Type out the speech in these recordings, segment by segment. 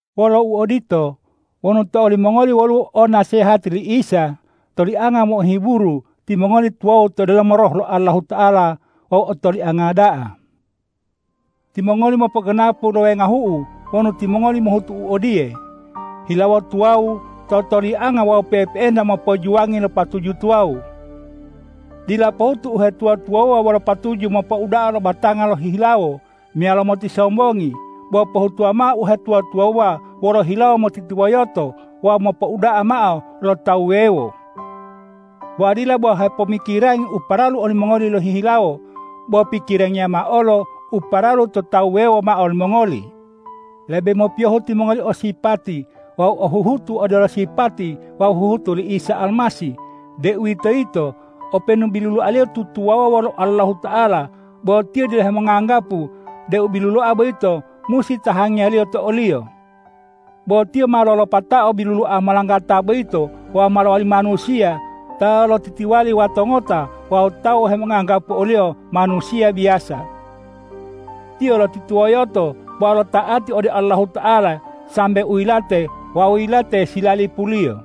Wolo uodito, wonu to olimongoli woluwo o nasehati li Isa, tolianga mo'ohiburu, timongoli tuwawu to delomo Roh lo Allahuta'ala wawu otolianga da'a. Timongoli mopoganapu lo wengahu'u wonu timongoli mohutu u odiye, hilawo tuwawu, totolianga wawu pe'epe'enta mopojuwangi lo patuju tuwawu. Dila pohutu uhetuwa-tuwawuwa wolo patuju mopouda'a lo batanga lohihilawo meyalo motisombongi, bo pohutuwa mao uhetuwa-tuwawuwa wolo hilawo motitiwoyoto wawu mopouda'a mao lo tawu wuwewo. Wawu dila bo hepomikirangi u paralu olimongoli lohihilawo, bo pikirangiya mao olo u paralu to tawu wuwewo mao limongoli. Lebe mopiyohu timongoli o sipati wawu o huhutu odelo sipati wawu huhutu li Isa Almasih, deuwitoyito openu biluloa-Liyo tutuwawuwa wolo Allahuta'ala, bo Tiyo dila hemonganggapu deu biluloa boyito musi tahangiyaliyo to o-Liyo. Bo Tiyo ma lolopatao biluloa molanggata boyito wawu ma lowali manusiya ta lotitiwali wato ngota wawu tawu hemonganggapu o-Liyo manusiya biyasa. Tiyo lotitiwoyoto wawu lota'ati ode Allahuta'ala sambe u yilate wawu yilate silalipuliyo.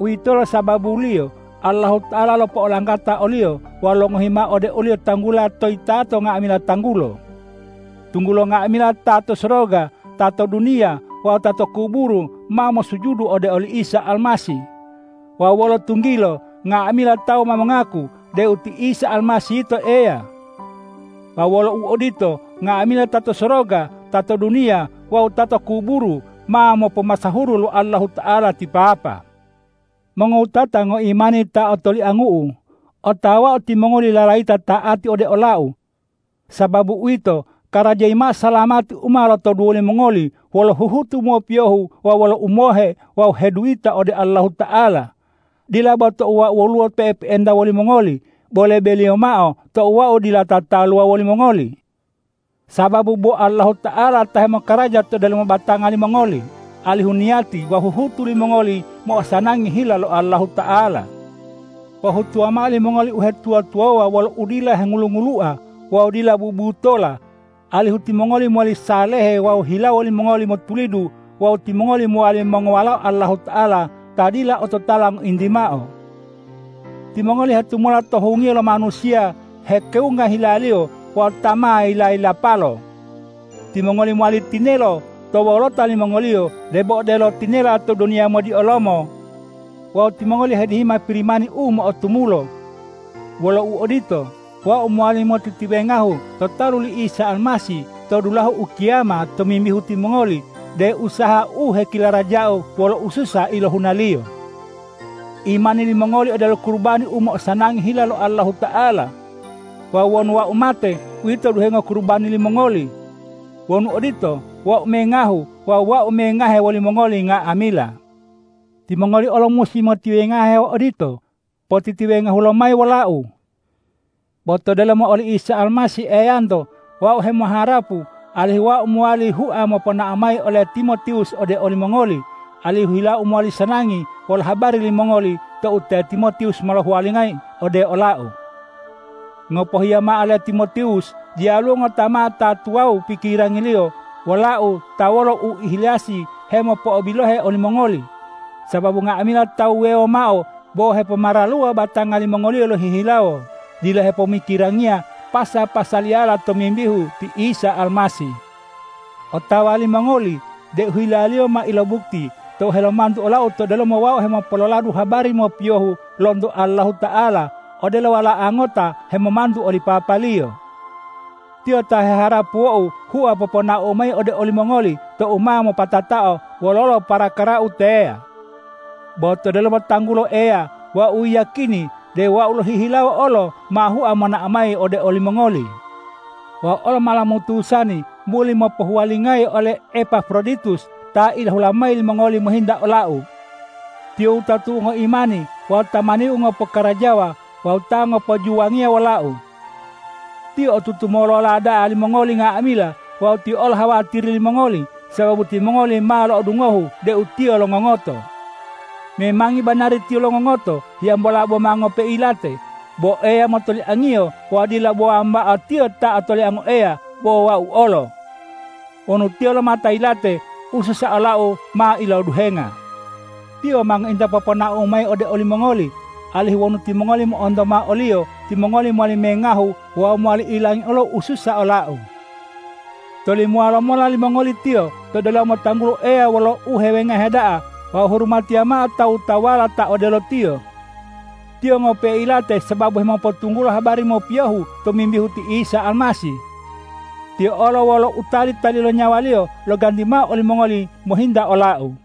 Uwitolo sababuliyo Allahuta'ala lopo'olanggata o-Liyo wawu longohi mao ode o-Liyo tanggula toyitato nga'amila tanggulo, tunggulo nga'amila ta to soroga, ta to duniya wawu ta to kuburu ma mosujudu ode oli Isa Almasih, wawu wolo tunggilo nga'amila tawu ma mongaku deu ti Isa Almasih yito Eya. Wawu wolo uodito, nga'amila ta to soroga, ta to duniya wawu ta to kuburu ma mopomasahuru lo Allahuta'ala ti Papa. Mongowutata ngoimani ta otoliangu'u, otawau timongoli lalayita ta'ati ode olau. Sababu uwito, karajayi mao salamati u ma lotoduwo limongoli wolo huhutu mopiyohu wawu wolo umohe wawu heduyita ode Allahuta'ala, dila bo tou wau woluwo pe'epe'enta wolimongoli, bo lebeliyo mao tou wau dila tataluwa wolimongoli. Sababu bo Allahuta'ala ta hemokaraja to delomo batanga limongoli, alihu niyati wawu huhutu limongoli mo'osanangi hila lo Allahuta'ala. Pohutuwa mao limongoli uhetuwa-tuwawuwa wolo udila hengulu-ngulua wawu dila bubutola, alihu timongoli mowali salehe wawu hilawo limongoli motulidu wawu timongoli mowali mongowalao Allahuta'ala ta dila ototala ngointi mao. Timongoli hetumula to hungiyo lo manusiya hekewunga hilaliyo wawu ta ma yila-yilapalo. Timongoli mowali tinelo to wolota limongoliyo debo odelo tinela to duniya modiolomo wawu timongoli hedihima Pirimani u mo'otumulo. Wolo uodito, wau mowali motitiwengahu to talu li Isa Almasih to dulahu ukiyama tomimbihu timongoli deu usahau u hekilarajau wolo ususa ilohunaliyo. Imani limongoli odelo kurubani u mo'osanangi hila lo Allahuta'ala. Wawu wonu wau mate, uwito duhengo kurubani limongoli. Wonu odito, wau mengahu wawu wau ma mengahe wolimongoli nga'amila. Timongoli olo musi motiwengahe odito; potitiwengahu lomayi wolau. Bo to delomo oli Isa Almasih Eyanto wau hemoharapu alihu wau mowali hua moponao mayi ole Timotiwus ode olimongoli, alihu hilau mowali sanangi wolo habari limongoli tou te Timotiwus mohuwalingayi ode olau. Ngopohiya mao le Timotiwus diyaluwo ngota mao ta tuwawu pikirangiliyo wolau ta wolo uihilasi hemopo'obilohe olimongoli, sababu nga'amila tawu wuwewo mao bo hepomaraluwa batanga limongoliyo lohihilawo, dila hepomikirangiya pasa-pasaliyala tomimbihu ti Isa Almasih. Otawa limongoli deu hilaliyo ma ilobukti tou helomantu olau to delomo wau hemopololadu habari mopiyohu lonto Allahuta'ala, odelo wala'a ngota hemomantu oli papaliyo. Tiyo ta heharapuwou hua poponaou mayi ode olimongoli tou ma mopatatao wololo parakarau teya; bo to delomo tanggulo Eya wau yiyakini deu wau lohihilawo olo ma hua monao mayi ode olimongoli. Wau olo ma lomutusani muli mopowuwalingayi ole Epafroditus ta ilahula mayi limongoli mohinta olau. Tiyo wutatu'u ngoimani wawu tamaniu ngopokarajawa wawu ta ngopojuwangiya wolau. Tiyo otutu molola da'a limongoli nga'amila wawu tiyo olo hawatiri limongoli, sababu timongoli ma lo'odungohu deu tiyo longongoto. Memangi banari tiyo longongoto hiyambola boma ngope'e yilate, bo Eya motoliangiyo wawu dila bo wambao tiyo ta otoliango Eya, bo wau olo. Wonu tiyo lomata yilate, ususa olau ma iloduhenga. Tiyo ma ngointa poponaou mayi ode olimongoli, alihu wonu timongoli mo'onto mao oliyo, timongoli mowali mengahu wawu mowali ilangi olo ususa olau. Tolimowa lomao limongoli tiyo to delomo tanggulo Eya wolo uhewengahe da'a wawu hurumatiya mao tawu-tawuwala ta odelo tiyo. Tiyo ngope'e yilate sababu hemopotunggulo habari mopiyohu tomimbihu ti Isa Almasih. Tiyo olo wolo u tali-tali lo nyawaliyo loganti mao olimongoli mohinta olau.